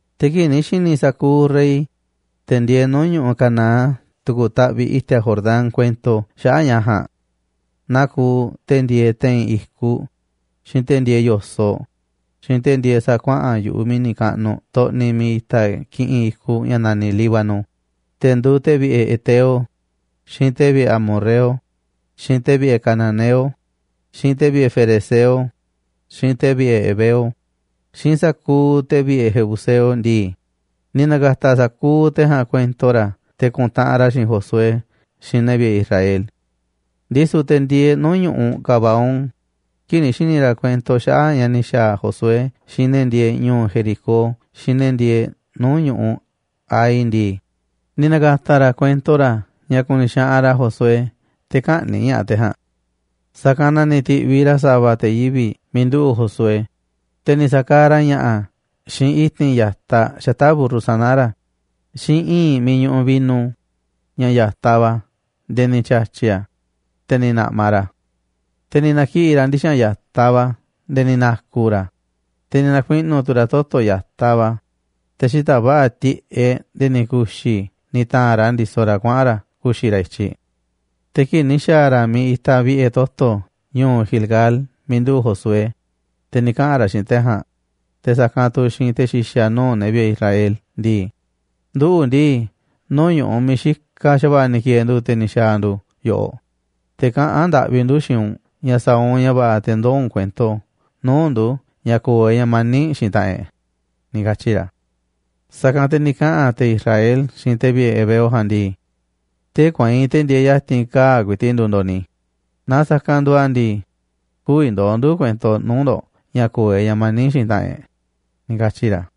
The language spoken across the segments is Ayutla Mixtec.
Te̱ kii̱ꞌ ni̱ xi̱ni̱ sa̱kuuꞌ rey, te̱ ndieeꞌ nuu̱ꞌ ñu̱ꞌuꞌ Canaán tu̱ku̱ taꞌviꞌ i̱ti̱a̱ Jordán, kuento xaꞌa̱ꞌ ña̱ ja̱a̱nꞌ, naa kuuꞌ te̱ ndieeꞌ te̱i̱n i̱kuꞌ, xiinꞌ te̱ ndieeꞌ yo̱soꞌ, xiinꞌ te̱ ndieeꞌ sa̱a̱ kuaꞌa̱n yu̱ꞌuꞌ mi̱ni̱ kaꞌnuꞌ xtoꞌniꞌ miiꞌ itaꞌ kiꞌinꞌ i̱kuꞌ ña̱ naniꞌ Líbano, te̱ nduuꞌ te̱ vi̱ꞌe̱ heteo, xiinꞌ te̱ vi̱ꞌe̱ amorreo, xiinꞌ te̱ vi̱ꞌe̱ cananeo, xiinꞌ te̱ vi̱ꞌe̱ ferezeo, xiinꞌ te̱ vi̱ꞌe̱ heveo, xiinꞌ sa̱kuuꞌ te̱ vi̱ꞌe̱ jebuseo ndii, ni̱ na̱ka̱ta̱ sa̱kuuꞌ te̱ ja̱a̱nꞌ kuento ra̱ te̱ ku̱ntaꞌanꞌ ra̱ xiinꞌ Josué xiinꞌ ne̱ vi̱ꞌe̱ Israel. Ndisu̱ te̱ ndieeꞌ nuu̱ꞌ ñu̱ꞌuꞌ Gabaón, kii̱ꞌ ni̱ xi̱ni̱ ra̱ kuento xaꞌa̱ꞌ ña̱ ni̱ xa̱a̱ Josué xiinꞌ ne̱ ndieeꞌ ñu̱u̱ Jericó xiinꞌ ne̱ ndieeꞌ nuu̱ꞌ ñu̱ꞌuꞌ Hai ndii, ni̱ na̱ka̱ta̱ ra̱ kuento ra̱ ña̱ ku̱ni̱ xaꞌanꞌ ra̱ Josué te̱ kä̱ꞌni̱ꞌ ña̱ꞌaꞌ te̱ ja̱a̱nꞌ. Sa̱kanꞌ na ni̱ ti̱ꞌviꞌ ra̱ sava̱ te̱ yivi̱ꞌ miiꞌ nduꞌu̱ꞌ Josué, te̱ ni̱ sa̱kaaꞌ ra̱ ña̱ꞌa̱ xiinꞌ i̱ti̱n ya̱taꞌ xata̱ꞌ mburru sana̱ ra̱, xiinꞌ i̱i̱nꞌ miiꞌ ñuꞌuꞌ vino, ña̱ ya̱taꞌ va̱ nde̱e̱ ni̱ tya̱tyi̱ a̱, te̱ ni̱ na̱ꞌmaꞌ ra̱ a̱. Te̱ ni̱ na̱kiꞌi̱ ra̱ ndixa̱nꞌ ya̱taꞌ va̱ nde̱e̱ ni̱ na̱ku̱ ra̱ a̱, te̱ ni̱ na̱kuiꞌnu̱ tu̱ ra̱ toto̱ ya̱taꞌ va̱, te̱ xita̱ꞌ va̱ꞌa̱ tiꞌeꞌ nde̱e̱ ni̱ ku̱xi̱ ni̱ ta̱a̱n ra̱ ndisoꞌ ra̱ kuaꞌa̱n ra̱ ku̱xi̱ ra̱ i̱tyiꞌ. Te̱ kii̱ꞌ ni̱ xa̱a̱ ra̱ miiꞌ itaꞌ vi̱ꞌe̱ toto̱ ñu̱u̱ Gilgal miiꞌ nduꞌu̱ꞌ Josué, te̱ ni̱ kaꞌa̱n ra̱ xiinꞌ te̱ ja̱a̱nꞌ, te̱ sa̱kanꞌ tu̱ xiinꞌ te̱ xi̱xa̱ nuu̱ꞌ ne̱ vi̱ꞌe̱ Israel ndii: ―Nduꞌu̱ ndii, nuu̱ꞌ ñu̱ꞌuꞌ miiꞌ xikaꞌ xa̱va̱ꞌa̱ ni̱ ki̱e̱e̱ ndu̱, te̱ ni̱ xa̱a̱ ndu̱ yoꞌoꞌ, te̱ kaꞌán ndaꞌvi ndu̱ xiinꞌ u̱nꞌ ña̱ sa̱a̱ u̱nꞌ ña̱ va̱ꞌa̱ te̱ ndoo̱ u̱nꞌ kuento nuu̱ꞌ ndu̱ ña̱ ko̱o̱ e̱ꞌ ña̱ mani̱ꞌ xiinꞌ taꞌanꞌ e̱ꞌ ―ni̱ katyi̱ ra̱. Sa̱kanꞌ te̱ ni̱ kaꞌa̱n te̱ Israel xiinꞌ te̱ vi̱ꞌe̱ heveo ja̱a̱nꞌ ndii: ―Tee̱ꞌ kueinꞌ te̱ ndieeꞌ ya̱ti̱n kaa̱ꞌ ku̱i̱ti̱ꞌ nduuꞌ ndo̱ꞌ ni̱, naaꞌ sa̱kanꞌ nduuꞌ a̱ ndii, kü̱vi̱ ndoo̱ ndu̱ kuento nuu̱ꞌ ndo̱ꞌ ña̱ ko̱o̱ e̱ꞌ ña̱ mani̱ꞌ xiinꞌ taꞌanꞌ e̱ꞌ ―ni̱ katyi̱ ra̱.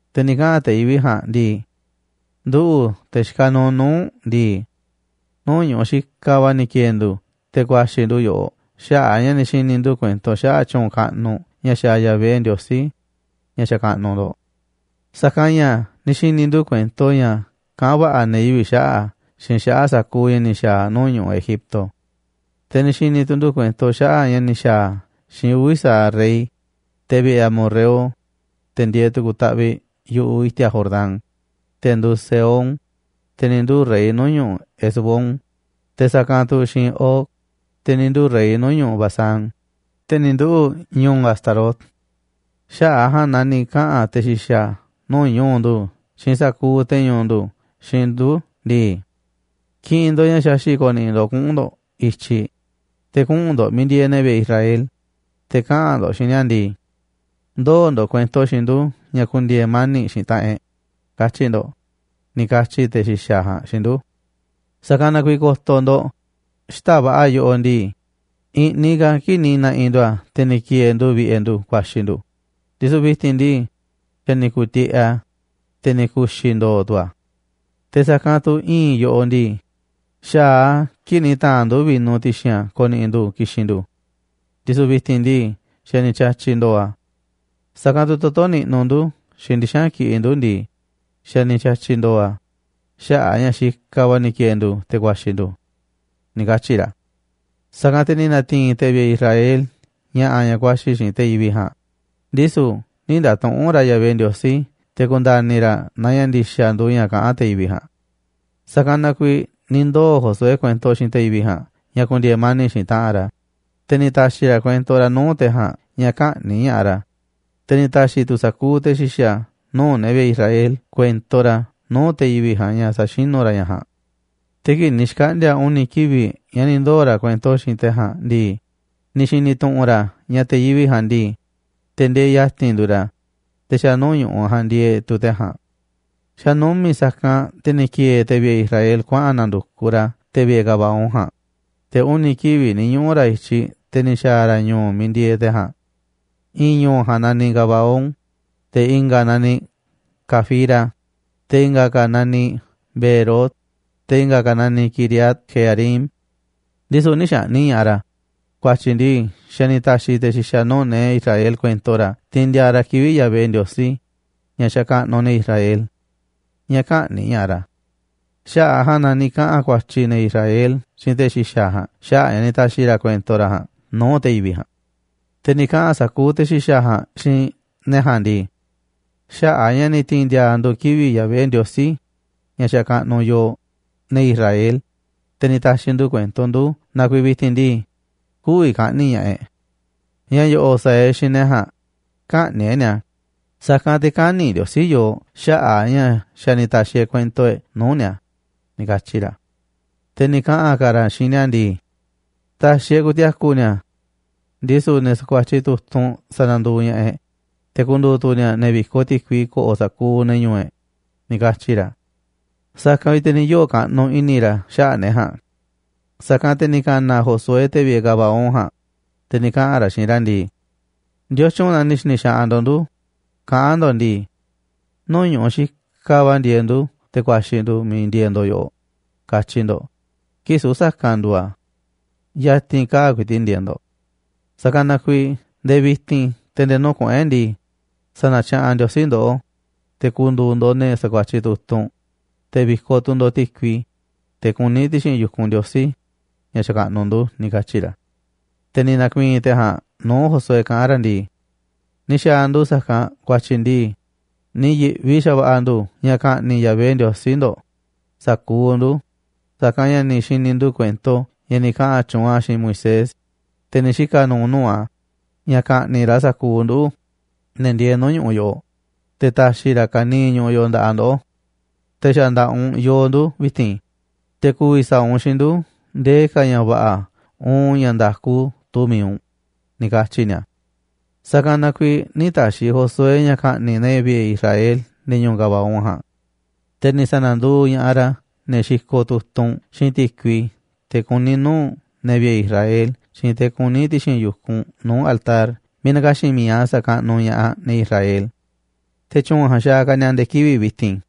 Te̱ ni̱ kaꞌa̱n te̱ yivi̱ꞌ ja̱a̱nꞌ ndii: ―Nduꞌu̱, te̱ xikaꞌ nuuꞌ nuu̱ꞌ u̱nꞌ ndii, nuu̱ꞌ ñu̱ꞌuꞌ xikaꞌ va̱ ni̱ ki̱e̱e̱ ndu̱ te̱ ku̱a̱xi̱ ndu̱ yoꞌoꞌ xaꞌa̱ꞌ a̱ ña̱ ni̱ xi̱ni̱ ndu̱ kuento xaꞌa̱ꞌ tyu̱u̱n kaꞌnuꞌ ña̱ xaaꞌ Yahvé, Ndiosí ña̱ xakaꞌnuꞌ ndo̱ꞌ. Sa̱kanꞌ ña̱ ni̱ xi̱ni̱ ndu̱ kuento ña̱ kaꞌán va̱ꞌa̱ ne̱ yivi̱ꞌ xaꞌa̱ꞌ a̱ xiinꞌ xaꞌa̱ꞌ sa̱kuuꞌ ña̱ ni̱ xa̱a̱ a̱ nuu̱ꞌ ñu̱ꞌuꞌ Egipto. Te̱ ni̱ xi̱ni̱ tu̱ ndu̱ kuento xaꞌa̱ꞌ ña̱ ni̱ xa̱a̱ a̱ xiinꞌ uvi̱ sa̱aꞌ rey, te̱ vi̱ꞌe̱ amorreo, te̱ ndieeꞌ tu̱ku̱ taꞌviꞌ yu̱ꞌuꞌ i̱ti̱a̱ Jordán, te̱ nduuꞌ Sehón, te̱ ni̱ nduu̱ rey nuu̱ꞌ ñu̱ꞌuꞌ Hesbón, te̱ sa̱kanꞌ tu̱ xiinꞌ Og, te̱ ni̱ nduu̱ rey nuu̱ꞌ ñu̱ꞌuꞌ Basán, te̱ ni̱ nduꞌu̱ꞌ ñu̱u̱ Astarot. Xaꞌa̱ꞌ a̱ ja̱a̱nꞌ na ni̱ kaꞌa̱n te̱ xi̱xa̱ nuu̱ꞌ ñu̱u̱ ndu̱ xiinꞌ sa̱kuuꞌ te̱ ñu̱u̱ ndu̱ xiinꞌ ndu̱ ndii: “Ki̱ꞌi̱n ndo̱ꞌ ña̱ xaxi̱ꞌ ko̱ni̱ꞌi̱ ndo̱ꞌ kuꞌu̱n ndo̱ꞌ i̱tyiꞌ, te̱ kuꞌu̱n ndo̱ꞌ miiꞌ ndieeꞌ ne̱ vi̱ꞌe̱ Israel, te̱ kaꞌa̱n ndo̱ꞌ xiinꞌ ni̱a̱ ndii: Ndoo̱ ndo̱ꞌ kuento xiinꞌ ndu̱ ña̱ ku̱ndi̱e̱e̱ mani̱ꞌ xiinꞌ taꞌanꞌ e̱ꞌ, katyi̱ ndo̱ꞌ”, ni̱ katyi̱ te̱ xi̱xa̱ ja̱a̱nꞌ xiinꞌ ndu̱. Sa̱kanꞌ na kuiiꞌ ko̱to̱ ndo̱ꞌ, xita̱ꞌ va̱ꞌa̱ yoꞌoꞌ ndii, i̱ꞌniꞌ ka̱ a̱ kii̱ꞌ ni̱ na̱ꞌi̱ ndu̱ a̱ te̱ ni̱ ki̱e̱e̱ ndu̱ vi̱ꞌe̱ ndu̱ ku̱a̱xi̱ ndu̱, ndisu̱ vi̱ti̱n ndii, xa̱ ni̱ ku̱tiꞌeꞌ a̱, te̱ ni̱ ku̱xi̱ ndo̱o̱ tu̱ a̱. Te̱ sa̱kanꞌ tu̱ i̱i̱nꞌ yoꞌoꞌ ndii, xa̱aꞌ a̱ kii̱ꞌ ni̱ ta̱a̱nꞌ ndu̱ vino ti̱xi̱n a̱ ko̱ni̱ꞌi̱ ndu̱ ki̱xi̱n ndu̱, ndisu̱ vi̱ti̱n ndii, xa̱ ni̱ tya̱tyi̱ ndo̱o̱ a̱. Sa̱kanꞌ tu̱ toto̱ niꞌnuꞌ ndu̱ xiinꞌ ndixa̱nꞌ kiꞌiꞌ ndu̱ ndii, xa̱ ni̱ tya̱tyi̱ ndo̱o̱ a̱ xaꞌa̱ꞌ a̱ ña̱ xikaꞌ va̱ ni̱ ki̱e̱e̱ ndu̱ te̱ ku̱a̱xi̱ ndu̱ ―ni̱ katyi̱ ra̱. Sa̱kanꞌ te̱ ni̱ na̱ti̱i̱n te̱ vi̱ꞌe̱ Israel ña̱ꞌa̱ ña̱ ku̱a̱xi̱ xiinꞌ te̱ yivi̱ꞌ ja̱a̱nꞌ, ndisu̱ nï̱ nda̱tuꞌu̱nꞌ ra̱ Yahvé Ndiosí te̱ ku̱nda̱ni̱ ra̱ naaꞌ ña̱ ndi̱xa̱ nduuꞌ ña̱ kaꞌán te̱ yivi̱ꞌ ja̱a̱nꞌ. Sa̱kanꞌ na kuiiꞌ ni̱ ndoo̱ Josué kuento xiinꞌ te̱ yivi̱ꞌ ja̱a̱nꞌ ña̱ ku̱ndi̱e̱e̱ mani̱ꞌ xiinꞌ taꞌanꞌ ra̱, te̱ ni̱ ta̱xi̱ ra̱ kuento ra̱ nuu̱ꞌ te̱ ja̱a̱nꞌ ña̱ kä̱ꞌni̱ꞌ ña̱ꞌaꞌ ra̱, te̱ ni̱ ta̱xi̱ tu̱ sa̱kuuꞌ te̱ xi̱xa̱ nuu̱ꞌ ne̱ vi̱ꞌe̱ Israel kuento ra̱ nuu̱ꞌ te̱ yivi̱ꞌ ja̱a̱nꞌ ña̱ sa̱xinú ra̱ ña̱ ja̱a̱nꞌ. Te̱ kii̱ꞌ ni̱ xkaꞌndi̱a̱ uni̱ kivi̱ꞌ ña̱ ni̱ ndoo̱ ra̱ kuento xiinꞌ te̱ ja̱a̱nꞌ ndii, ni̱ xi̱ni̱ tu̱ꞌu̱n ra̱ ña̱ te̱ yivi̱ꞌ ja̱a̱nꞌ ndii, te̱ ndieeꞌ ya̱ti̱n nduuꞌ ra̱, te̱ xa̱ nuu̱ꞌ ñu̱ꞌuꞌ ja̱a̱nꞌ ndieeꞌ tu̱ te̱ ja̱a̱nꞌ. Xa̱ numi̱ꞌ sa̱kanꞌ te̱ ni̱ ki̱e̱e̱ te̱ vi̱ꞌe̱ Israel kuaꞌa̱n na̱ndu̱kuꞌ ra̱ te̱ vi̱ꞌe̱ Gabaón ja̱a̱nꞌ, te̱ uni̱ kivi̱ꞌ ni̱ ñuꞌu̱ ra̱ i̱tyiꞌ te̱ ni̱ xa̱a̱ ra̱ ñu̱u̱ miiꞌ ndieeꞌ te̱ ja̱a̱nꞌ. I̱i̱n ñu̱u̱ ja̱a̱nꞌ naniꞌ Gabaón, te̱ i̱nga̱ a̱ naniꞌ Cafira, te̱ i̱nga̱ ka̱ a̱ naniꞌ Beerot, te̱ i̱nga̱ a̱ naniꞌ Quiriat-jearim. Ndisu̱ nï̱ xa̱ꞌni̱ꞌ ña̱ꞌaꞌ ra̱, ku̱a̱tyi̱ ndii, xa̱ ni̱ ta̱xi̱ te̱ xi̱xa̱ nuu̱ꞌ ne̱ Israel kuento ra̱ tiinꞌ ndiaa ra̱ kivi̱ꞌ Yahvé, Ndiosí ña̱ xakaꞌnuꞌ ne̱ Israel, ña̱ kä̱ꞌni̱ꞌ ña̱ꞌaꞌ ra̱. Xaꞌa̱ꞌ a̱ ja̱a̱nꞌ na ni̱ kaꞌa̱n ku̱a̱tyi̱ ne̱ Israel xiinꞌ te̱ xi̱xa̱ ja̱a̱nꞌ xaꞌa̱ꞌ a̱ ña̱ ni̱ ta̱xi̱ ra̱ kuento ra̱ ja̱a̱nꞌ nuu̱ꞌ te̱ yivi̱ꞌ ja̱a̱nꞌ. Te̱ ni̱ kaꞌa̱n sa̱kuuꞌ te̱ xi̱xa̱ ja̱a̱nꞌ xiinꞌ ne̱ ja̱a̱nꞌ ndii: ―Xaꞌa̱ꞌ a̱ ña̱ ni̱ ti̱i̱n ndi̱a̱a̱ ndu̱ kivi̱ꞌ Yahvé, Ndiosí ña̱ xakaꞌnuꞌ yooꞌ, ne̱ Israel, te̱ ni̱ ta̱xi̱ ndu̱ kuento ndu̱ na kuiiꞌ vi̱ti̱n ndii, kü̱vi̱ ka̱ꞌni̱ꞌ ña̱ꞌaꞌ e̱ꞌ. Ña̱ yo̱ꞌo̱ꞌ sa̱a̱ e̱ꞌ xiinꞌ ne̱ ja̱a̱nꞌ, kä̱ꞌni̱ꞌ e̱ꞌ ni̱a̱, sa̱kanꞌ te̱ kä̱ni̱ Ndiosí yooꞌ xaꞌa̱ꞌ a̱ ña̱ xa̱ ni̱ ta̱xi̱ e̱ꞌ kuento e̱ꞌ nuu̱ꞌ ni̱a̱ ―ni̱ katyi̱ ra̱. Te̱ ni̱ kaꞌa̱n ka̱ ra̱ xiinꞌ ni̱a̱ ndii: ―Ta̱xi̱ e̱ꞌ ku̱ti̱a̱ku̱ ni̱a̱, ndisu̱ ne̱ sa̱kuatyiꞌ tu̱tunꞌ sa̱na̱nduuꞌ ña̱ꞌaꞌ e̱ꞌ, te̱ ku̱ndu̱u̱ tu̱ ni̱a̱ ne̱ vi̱koꞌ ti̱kui ko̱ꞌo̱ sa̱kuuꞌ ne̱ ñu̱u̱ e̱ꞌ ―ni̱ katyi̱ ra̱. Sa̱kanꞌ vi̱ꞌ te̱ ni̱ yoo̱ kaꞌnuꞌ i̱ni̱ ra̱ xaꞌa̱ꞌ ne̱ ja̱a̱nꞌ. Sa̱kanꞌ te̱ ni̱ ka̱na̱ Josué te̱ vi̱ꞌe̱ Gabaón ja̱a̱nꞌ, te̱ ni̱ kaꞌa̱n ra̱ xiinꞌ ra̱ ndii: ―¿Ndiotyun na ni̱ xi̱ni̱ xaꞌanꞌ ndo̱ꞌ ndu̱ kaꞌán ndo̱ꞌ ndii: “Nuu̱ꞌ ñu̱ꞌuꞌ xikaꞌ va̱ ndieeꞌ ndu̱, te̱ ku̱a̱xi̱ ndu̱ miiꞌ ndieeꞌ ndo̱ꞌ yoꞌoꞌ”, katyi ndo̱ꞌ, kii̱ꞌ süu̱ꞌ sa̱kanꞌ nduuꞌ a̱? Ya̱ti̱n kaa̱ꞌ ku̱i̱ti̱ꞌ ndieeꞌ ndo̱ꞌ. Sa̱kanꞌ na kuiiꞌ nde̱e̱ vi̱ti̱n te̱ nde̱e̱ nuu̱ꞌ kuꞌu̱n e̱ꞌ ndii, sa̱na̱tya̱ꞌa̱n Ndiosí ndoꞌó, te̱ ku̱ndu̱u̱ ndo̱ꞌ ne̱ sa̱kuatyiꞌ tu̱tunꞌ, te̱ vi̱koꞌ tu̱ ndo̱ꞌ ti̱kui, teꞌ kuní ti̱xi̱n yu̱kunꞌ Ndiosí ña̱ xakaꞌnuꞌ ndu̱ ―ni̱ katyi̱ ra̱. Te̱ ni̱ na̱ku̱i̱i̱n te̱ ja̱a̱nꞌ nuu̱ꞌ Josué kaꞌán ra̱ ndii: ―Ni̱ xa̱a̱ ndu̱ sa̱kanꞌ ku̱a̱tyi̱ ndii, ni̱ yi̱ꞌvi xa̱va̱ꞌa̱ ndu̱ ña̱ ka̱ꞌni̱ꞌ Yahvé, Ndiosí ndo̱ꞌ, sa̱kuuꞌ ndu̱, sa̱kanꞌ ña̱ ni̱ xi̱ni̱ ndu̱ kuento ña̱ ni̱ kaꞌa̱n tyuunꞌ a̱ xiinꞌ Moisés, te̱ ni̱ xika̱ nu̱u̱ nuu̱ꞌ a̱, ña̱ ka̱ꞌni̱ꞌ ra̱ sa̱kuuꞌ nduꞌu̱, ne̱ ndieeꞌ nuu̱ꞌ ñu̱ꞌuꞌ yoꞌoꞌ, te̱ ta̱xi̱ ra̱ ka̱niiꞌ ñu̱ꞌuꞌ yoꞌoꞌ nda̱ꞌaꞌ ndoꞌó. Te̱ xa̱ nda̱ꞌaꞌ u̱nꞌ yooꞌ ndu̱ vi̱ti̱n, te̱ ku̱vi̱ sa̱a̱ u̱nꞌ xiinꞌ ndu̱ ndee ka̱ ña̱ va̱ꞌa̱ uun ña̱ nda̱ku tuu mi̱iꞌ u̱nꞌ ―ni̱ katyi̱ ni̱a̱. Sa̱kanꞌ na kuiiꞌ nï̱ ta̱xi̱ Josué ña̱ ka̱ꞌni̱ꞌ ne̱ vi̱ꞌe̱ Israel ne̱ ñu̱u̱ Gabaón ja̱a̱nꞌ. Te̱ ni̱ sa̱na̱nduuꞌ ña̱ꞌaꞌ ra̱ ne̱ xikoꞌ tu̱tunꞌ xiinꞌ ti̱kui teꞌ kuní nuu̱ꞌ ne̱ vi̱ꞌe̱ Israel xiinꞌ teꞌ kuní ti̱xi̱n yu̱kunꞌ nuu̱ꞌ altar miiꞌ na̱ka̱xi̱n mi̱iꞌ a̱ sa̱kaꞌnuꞌ ña̱ꞌaꞌ ne̱ Israel. Te̱ tyu̱u̱n ja̱a̱nꞌ xaaꞌ ka̱ ni̱a̱ nde̱e̱ kivi̱ꞌ vi̱ti̱n.